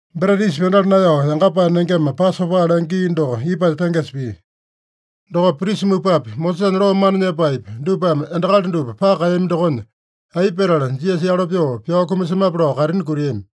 Breta Yisa Pyandala Naeyao Yangapae Nengema, Pasopa lenge gii doko ipanya tengesa pia. Dokopa prisa mupapi, Mosesanya loo mana nyepaepi, dupame endakali dupa paka kaeyami dokonya, aipa petala Jisasa yalo pyoo pyao kumasemape lao kaitini kutiami.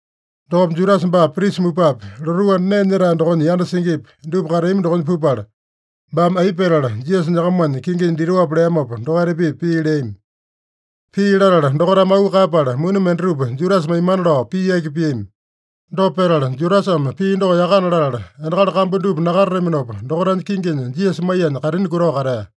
Dokopa Judasa baa prisa mupapi, lotuu anda nee nyetae dokonya yanda singipi, dupa kateami dokonya pupala, baame aipa petala Jisasa nyakamanya kinginya ditoape leamopa dokaita-pipa pii leami. Pii latala dokaitame auu kaeyapala, muni mendatupa Judasa maimana lao pii yaki piami. Dopa petala, Judasame pii doko yakana latala, endakali kambu dupa nakatataminopa dokaitanya kinginya Jisasa maiyanya kaitini kutao katea.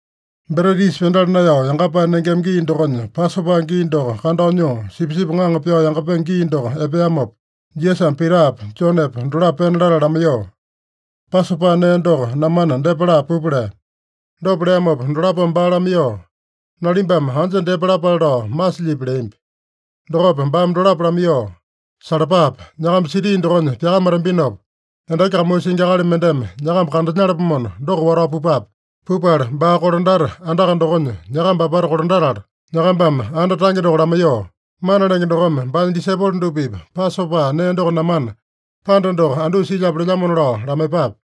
Breta Yisa Pyandala Naeyao Yangapae Nengema gii dokonya, Pasopa gii doko kandao nyoo, sipisipi ŋaŋa pyao yangapenge gii doko epeamopa, Jisasame Pitapa, Jonepa dolapo pena latala lamaiyoo, “Pasopa nee doko namana, depa laa pupa” lea. Dopa leamopa dolapome baa lamaiyoo, “Nalimbame anja depa lapale lao masilyipi?” leambi. Dokopa baame dolapo lamaiyoo, “Salapape! Nyakamba siti dokonya pyakamatambinopa, endaki kamuu singi akali mendeme nyakamba kandanyalapomona, doko watao pupape. Pupala, baa kolandata andaka dokonya nyakamba apata kolandatala, nyakambame anda tange doko lamaiyoo, ‘Mana Lenge dokome baanya disaipolo dupa-pipa Pasopa nee doko namana, panda doko andusa silyape lelyamona’ lao lamaiyepape.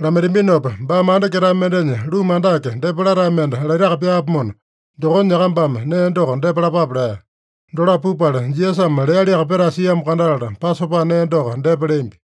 Lamaitambinopa baame anda ketae mendenya ruma andake, depa latae mende laitaka pyaapomona, dokonya nyakambame nee doko depa lapape” lea. Dolapo pupala, Jisasame lealiaka petae siamo kandatala, Pasopa nee doko depa leambi.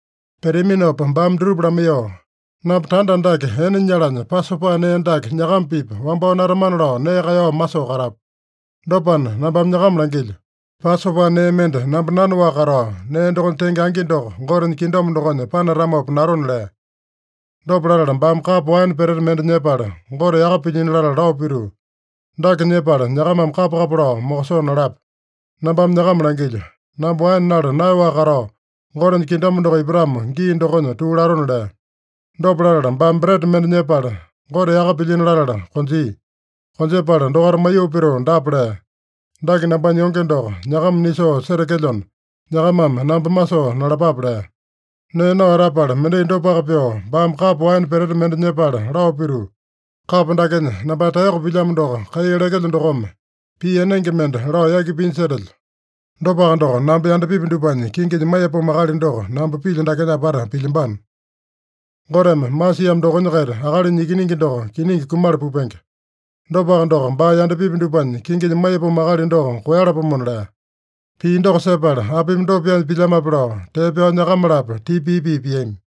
Peteaminopa baame dutupa lamaiyoo, “Namba tanda andake ene nyalanya, Pasopa nee dake nyakama-pipa wambao natamana lao nee kaeyao masoo katapu. Dopana nambame nyakama langilyo: Pasopa nee mende namba nanaowaka katao, nee dokonya tenge angi doko Gotenya kingdom dokonya panatamopa natona” lea. Dopa latala baame kapo waene peteta mende nyepala, Gote yaka pilyino latala lao pituu, “Dake nyepala nyakamame kapa-kapa lao mokosoo nalapa. Nambame nyakama langilyo: Namba waene nala naeyaowaka katao, Gotenya kingdom doko ipatamo gii dokonya tuu latona” lea. Dopa latala baame breta mende nyepala, Gote yaka pilyino latala konjia. Konjepala dokaita maiyoo pituu dapa lea: “Dake nambanya yonge doko, nyakama nisoo setekelyona, nyakamame namba masoo nalapape” lea. Nee nao etapala, mendai dopaka pyoo baame kapo waene peteta mende nyepala lao pituu, “Kapo dakenya nambanya taeyoko pilyamo doko kai lekelyo dokome, pii enenge mende lao yaki pinya setelyo. Dopaka doko, namba yandapipi dupanya kinginya maiyapomo akali doko namba pilyo dakenya apata pilyambano. Goteme masiamo dokonya-kaita Akalinya Ikiningi doko kiningi kumala pupenge. Dopaka doko, baa yandapipi dupanya kinginya maiyapomo akali doko koeyalapomona!” lea. Pii doko sepala, “Apimi dopa pyaanya pilyamape?” lao tee pyao nyakama-lapo tipa pii-pii piami.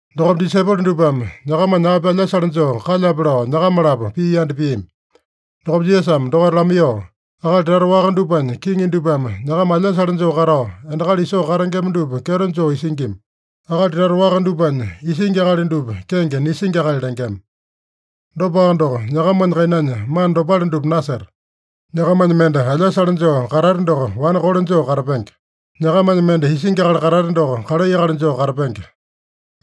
Dokopa disaipolo dupame nyakamanya api alyasale joo kalyape lao nyakama-lapo pii yanda piami. Dokopa Jisasame dokaita lamaiyoo, “Akali tata waka dupanya kiŋi dupame nyakama alyasale joo katao, endakali isoo katengema dupa kyeto joo isingima. Akali tata waka dupanya isingi akali dupa kenge Nisingi Akali lengema. Dopaka doko, nyakamanya kainanya mana dopale dupa naseta. Nyakamanya mende alyasale joo katate doko, wane kole joo katapenge. Nyakamanya mende isingi akali katate doko, kalai akali joo katapenge.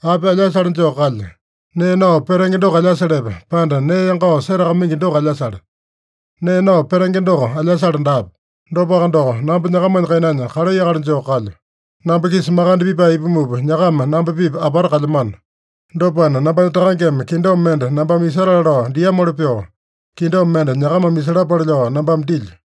Api alyasale joo kalya? Nee nao petenge doko alyasalepe, pande nee yangao setakamaingi doko alyasale? Nee nao petenge doko alyasale daape. Dopaka doko, namba nyakamanya kainanya kalai akali joo kalyo. “Namba-kisa makande pipae ipumupa, nyakama namba-pipa apata kalyamano. Dopana, nambanya Takangeme kingdom mende nambame isatale lao diamoli pyoo, kingdom mende nyakamame isalapale lao nambame dilyo.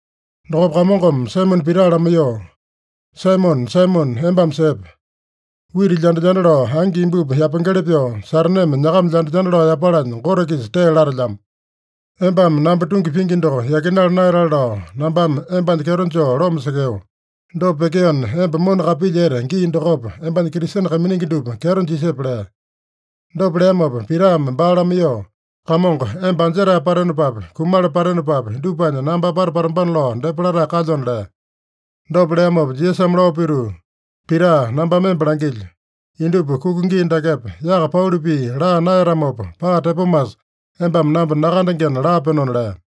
Dokopa Kamongome Saimone Pita lamaiyoo, “Saimone, Saimone, embame sepe! Wita lyanda-lyanda lao angi imbupi yapengeli pyoo, Sataneme nyakama lyanda-lyanda lao yapalanya Gote-kisa tee latelyamo. Embame namba tungi pingi doko yakinala naeyatale lao nambame embanya kyeto joo loma sekeo. Dopa pyekeona, emba mona kapilyete gii dokopa, embanya Kristene kaiminingi dupa kyeto jisepe” lea. Dopa leamopa Pitame baa lamaiyoo, “Kamongo, emba anjetae patenopapi, kumala patenopapi, dupanya namba apata patambana lao depa latae kalyona” lea. Dopa leamopa Jisasame lao pituu, “Pita, nambame emba langilyo: Indupa kuka gii dakepa, yaka pauli pii laa naeyatamopa, paa tepomasa embame namba nakandengena laapenona” lea.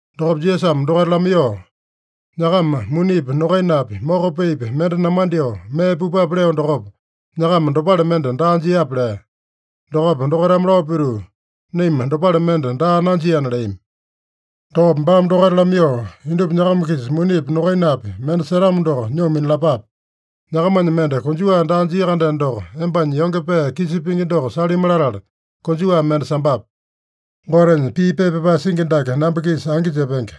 Dokopa Jisasame dokaita lamaiyoo, “Nyakama munipi, nokainapi, moko peepi mende namandyoo mee pupape leo dokopa, nyakama dopale mende daa jiape?” lea. Dokopa dokaitame lao pituu, “Naima dopale mende daa nanjiana” leami. Dokopa baame dokaita lamaiyoo, “Indupa nyakama-kisa munipi, nokainapi mende setamo doko, nyoo minalapape. Nyakamanya mende konjuwa daa jia-kandeno doko, embanya yonge pee kisa pingi doko salimi latala konjuwa mende sambape. Gotenya pii pepa pyapae singi dake namba-kisa angi jepenge: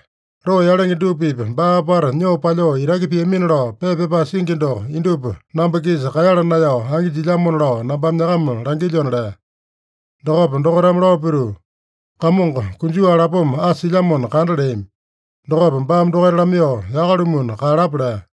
‘Loo yalenge dupa-pipa baa apata nyoo palyoo itaki piamina’ lao pepa pyapae singi doko indupa namba-kisa kaeyala naeyao angi jilyamona lao nambame nyakama langilyona” lea. Dokopa dokaitame lao pituu, “Kamongo, konjuwa lapoma asa silyamona kanda” leami. Dokopa baame dokaita lamaiyoo, “Yaka-lumuna kaeyalapa” lea.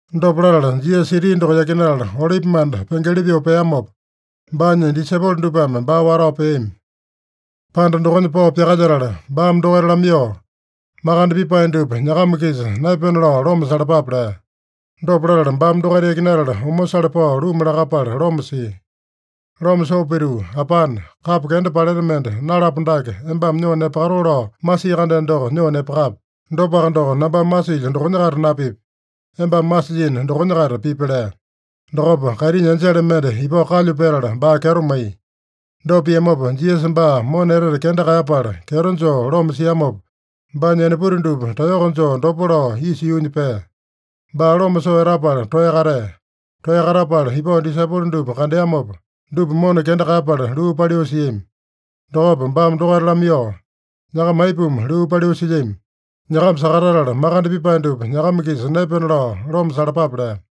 Dopa latala Jisasa siti doko yakinatala, Olipimanda pengeli pyoo peamopa, baanya disaipolo dupame baa watao peami. Panda dokonya pao pyakalyetala, baame dokaita lamaiyoo, “Makande pipae dupa nyakama-kisa naepena lao loma salapape” lea. Dopa latala baame dokaita yakinatala, omosale pao luma lakapala loma sia. Loma soo pituu, “Apane, kapo kenda paleta mende nalapo dake embame nyoo nepakatoo lao masii-kandeno doko, nyoo nepakape. Dopaka doko, nambame masilyo dokonya-kaita napipi. Embame masilyino dokonya-kaita pipi” lea. Dokopa kaitinya enjele mende ipao kalyu petala, baa kyeto maiya. Dopa piamopa, Jisasa baa mona etete kenda kaeyapala, kyeto joo loma siamopa, baanya enaputi dupa taeyoko joo dopo lao isa yuunya pea. Baa loma soo etapala toeya katea. Toeya katapala ipao disaipolo dupa kandeamopa, dupa mona kenda kaeyapala luu paliu siami. Dokopa baame dokaita lamaiyoo, “Nyakama aipuma luu paliu silyami? Nyakama sakatatala, makande pipae dupa nyakama-kisa naepena lao loma salapape” lea.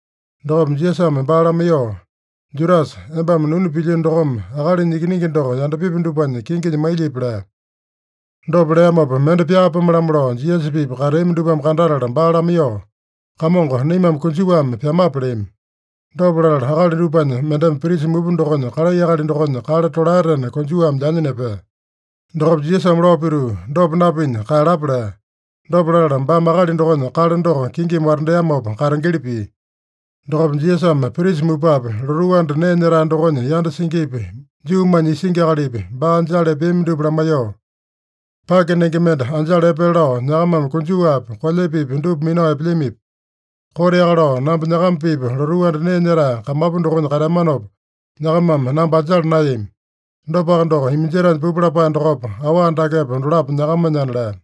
Dokopa Jisasame baa lamaiyoo, “Judasa, embame nunu pilyino dokome Akalinya Ikiningi doko yandapipi dupanya kinginya mailyipi?” lea. Dopa leamopa, mende pyaapome-lamo lao Jisasa-pipa kateami dupame kandatala baa lamaiyoo, “Kamongo, naimame konjuwame pyamape?” leami. Dopa latala akali dupanya mendeme prisa mupa dokonya kalai akali dokonya kale tolaetena konjuwame lyanya nepea. Dokopa Jisasame lao pituu, “Dopa napinya kaeyalapa!” lea. Dopa latala baame akali dokonya kale doko kingimi watandeamopa, katengeli pia. Dokopa Jisasame prisa mupapi, lotuu anda nee nyetae dokonya yanda singipi, Juumanya isingi akalipi, baa anjala epeami dupa lamaiyoo, “Pake nenge mende anjala epele lao nyakamame konjuwapi, kolyepepi dupa minao epelyamipi? Koteaka lao namba nyakama-pipa lotuu anda nee nyetae kamapu dokonya kateamanopa, nyakamame namba anjala naeyami. Dopaka doko, iminjetaenya pupu lapae dokopa, awa dakepa, dolapo nyakamanyana” lea.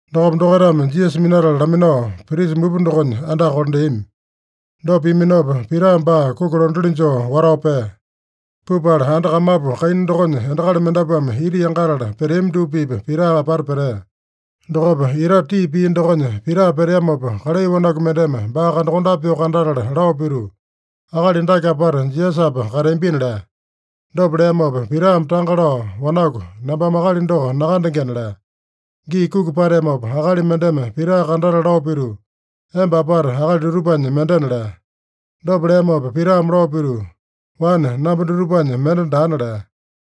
Dokopa dokaitame Jisasa minatala laminao, prisa mupa dokonya andaka kolandeami. Dopa piaminopa, Pita baa kuki londatili joo watao pea. Pupala, anda kamapu kaina dokonya endakali mendapuame ita yangatala peteami dupa-pipa Pita apata petea. Dokopa itate tii pia dokonya Pita peteamopa, kalai wanaku mendeme baa kandakondape pyoo kandatala lao pituu, “Akali dake apata Jisasapa kateambina” lea. Dopa leamopa Pitame tanga lao, “Wanaku, nambame akali doko nakandengena” lea. Gii kuki pateamopa, akali mendeme Pita kandatala lao pituu, “Emba apata akali dutupanya mendena” lea. Dopa leamopa Pitame lao pituu, “Wane, namba dutupanya mende daana” lea.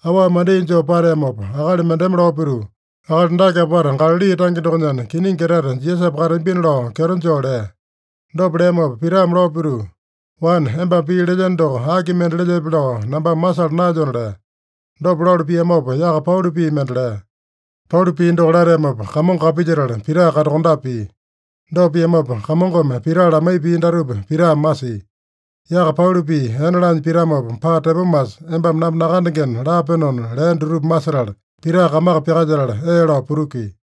Awa mendai joo pateamopa, akali mendeme lao pituu, “Akali dake apata Galali tange dokonyana, kiningi etete Jisasapa kateambina” lao kyeto joo lea. Dopa leamopa Pitame lao pituu, “Wane, embame pii lelyeno doko aki mende lelyepe lao nambame masala naelyona” lea. Dopa lalu piamopa, yaka pauli pii mende lea. Pauli pii doko lateamopa, Kamongo kapilyetala Pita kandakondape pia. Dopa piamopa, Kamongome Pita lamaiya pii datupa Pitame masia: “Yaka pauli pii ene laanya pitamopa, paa tepomasa embame namba nakandengena laapenona” lea dutupa masetala, Pita kamaka pyakalyetala, ee lao putukia.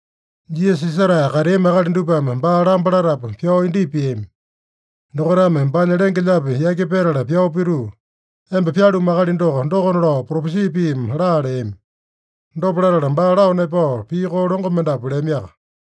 Jisasa isetae kateami akali dupame baa lamba latapu, pyao indyepa piami. Dokaitame baanya lenge-lyaapi yaki petala pyao pituu, “Emba pyalumu akali doko, dokona lao propesi piimi laa” leami. Dopa latala baa lao nepao, pii koo longo mendapu leamiaka.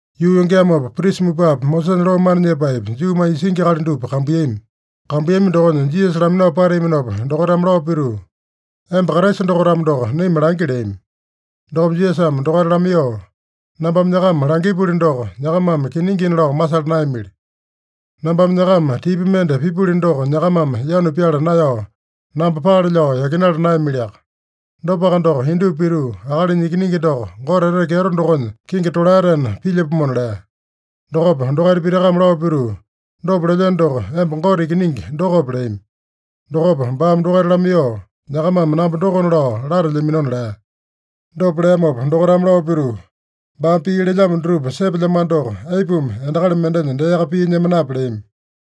Yuu yongeamopa, prisa mupapi, Mosesanya loo mana nyepaepi, Juumanya isingi akali dupa kambuiyami. Kambuiyami dokonya Jisasa laminao pateaminopa, dokaitame lao pituu, “Emba Kraisa doko-tamo doko, naima langi” leami. Dokopa Jisasame dokaita lamaiyoo, “Nambame nyakama langipuli doko, nyakamame kiningina lao masala naeyamili. Nambame nyakama tipa mende pipuli doko, nyakamame yanu pyala naeyao, namba paale lao yakinala naeyamiliaka. Dopaka doko, indupa pituu Akalinya Ikiningi doko, Gote etete kyeto dokonya kingi tolaetena pilyapomona” lea. Dokopa dokaita pitakame lao pituu, “Dopa lelyeno doko, emba Gote Ikiningi dokope?” leami. Dokopa baame dokaita lamaiyoo, “Nyakamame namba dokona lao latelyaminona” lea. Dopa leamopa dokaitame lao pituu, “Baame pii lelyamo dutupa sepelyamano doko, aipuma endakali mendenya deaka pii nyemanape?” leami.